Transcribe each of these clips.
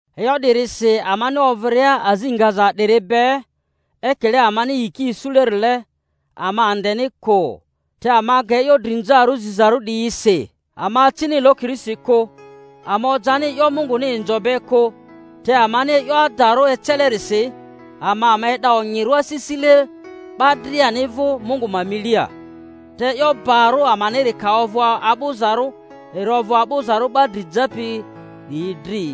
E'yo 'dirisi amani ovᴜria azi ngaza 'diri be, ekile amani yiki isulerile, ama andeni kᴜ. Te ama ga e'yo drinzarᴜ zizarᴜ 'diyi si, ama acini lokirisi kᴜ, ama ojani e'yo Munguni inzo be kᴜ; te amani e'yo adarᴜ ecelerisi, ama ama e'da onyirᴜ asisile 'ba driani vᴜ Mungu ma milia. Te e'yo barᴜ amaniri ka ovᴜ a'bᴜ-zarᴜ, eri ovᴜ a'bᴜzarᴜ 'ba dri japi 'diyi dri.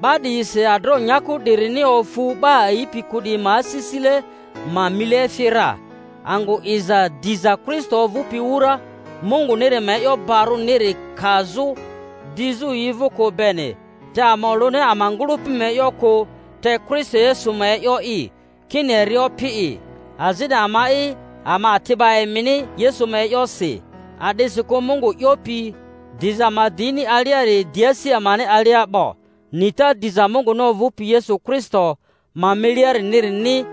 'Ba 'diyisi adroᴜ nyaku 'dirini ofu 'ba a'ipi kᴜ 'diyi ma asisile ma mile efi ra, angᴜ 'iza diza Kristo ovᴜpi wura Munguniri ma e'yo barᴜniri kazᴜ dizᴜ yi vᴜ kᴜ beni. Te ama olᴜni ama ngᴜlᴜpi ma e'yo kᴜ, te Kristo Yesu ma e'yo'i, kini eri Opi'i, azini ama'i ama ati'ba emini Yesu ma e'yosi. A'disikᴜ Mungu 'yopi, Diza ma di ini alia-ri di asi amani alia 'bo, nita diza Munguni ovᴜpi Yesu Kristo ma miliariniri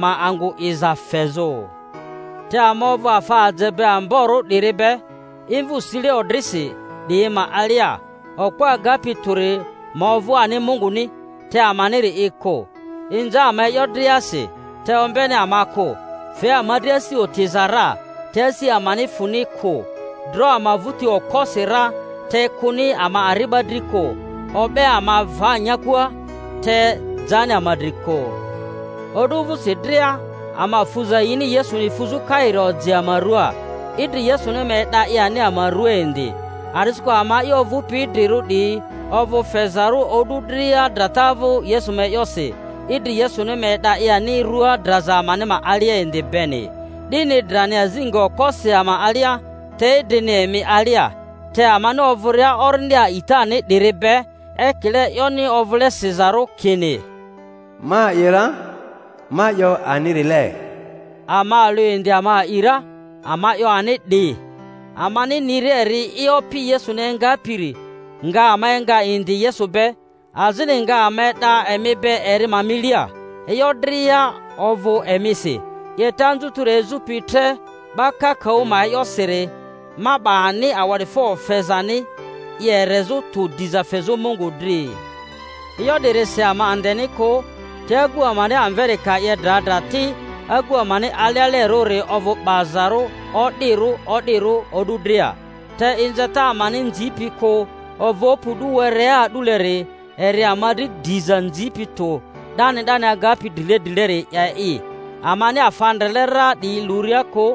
ma angᴜ 'iza fezᴜ. Te ama ovᴜ afa aje amborᴜ 'diri be imvᴜ sile odrisi 'diyi ma alia, okpo agapi tᴜri ma ovᴜ ani Munguni, te amaniri'i kᴜ. Inza ama e'yo driasi, te ombeni ama kᴜ; fe ama dri asi otiza ra, te asi amani fᴜni kᴜ; dro ama vᴜti okposi ra, te kᴜni ama ari'ba dri kᴜ; o'be ama va nyakua, te jani ama dri kᴜ; o'du vᴜsi dria ama fuza yini Yesuni fuzᴜ kairi oji ama ruaa, idri Yesuni ma e'da i ani ama ruaa indi. A'disikᴜ ama'i ovᴜpi idrirᴜ 'diyi ovᴜ fezarᴜ o'du dria drata vᴜ Yesu ma e'yosi, idri Yesuni ma e'da i ani rua draza amani ma alia indi beni. 'Dini drani azi nga okposi ama alia, te idrini emi alia. Te amani ovᴜria orindi a'itani 'diri be, ekile e'yoni ovᴜle sizarᴜ kini, Ma a'i ra, ma 'yo anirile, ama alᴜ indi ama a'i ra, ama 'yo ani 'di, amani niria eri'i Opi Yesuni engapiri nga ama enga indi Yesu be, azini nga ama e'da emi be eri ma milia. E'yo dria ovᴜ emisi, 'yeta anzutiri ezᴜpi tre 'ba kakaᴜ ma e'yosiri ma 'ba ani awa'difo fezani i erezᴜ tᴜ diza fezᴜ Mungu dri. E'yo 'dirisi ama andeni kᴜ, te agu amani amveri ka 'ye dra dra ti, agu amani alealerᴜri ovᴜ 'bazarᴜ o'dirᴜ o'dirᴜ o'du dria. Te inzata amani nzipi kᴜ ovᴜpi o'du werea a'duleri eri ama dri diza nzipi tᴜ 'dani 'dani agapi drile drileri 'ye'i, amani afa ndrele ra 'diyi luria kᴜ,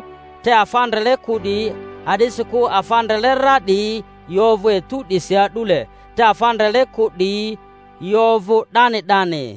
te afa ndrele kᴜ 'diyi; a'disikᴜ afa ndrele ra 'diyi yi ovᴜ etu 'disi a'dule, te afa ndrele kᴜ 'diyi yi ovᴜ 'dani 'dani.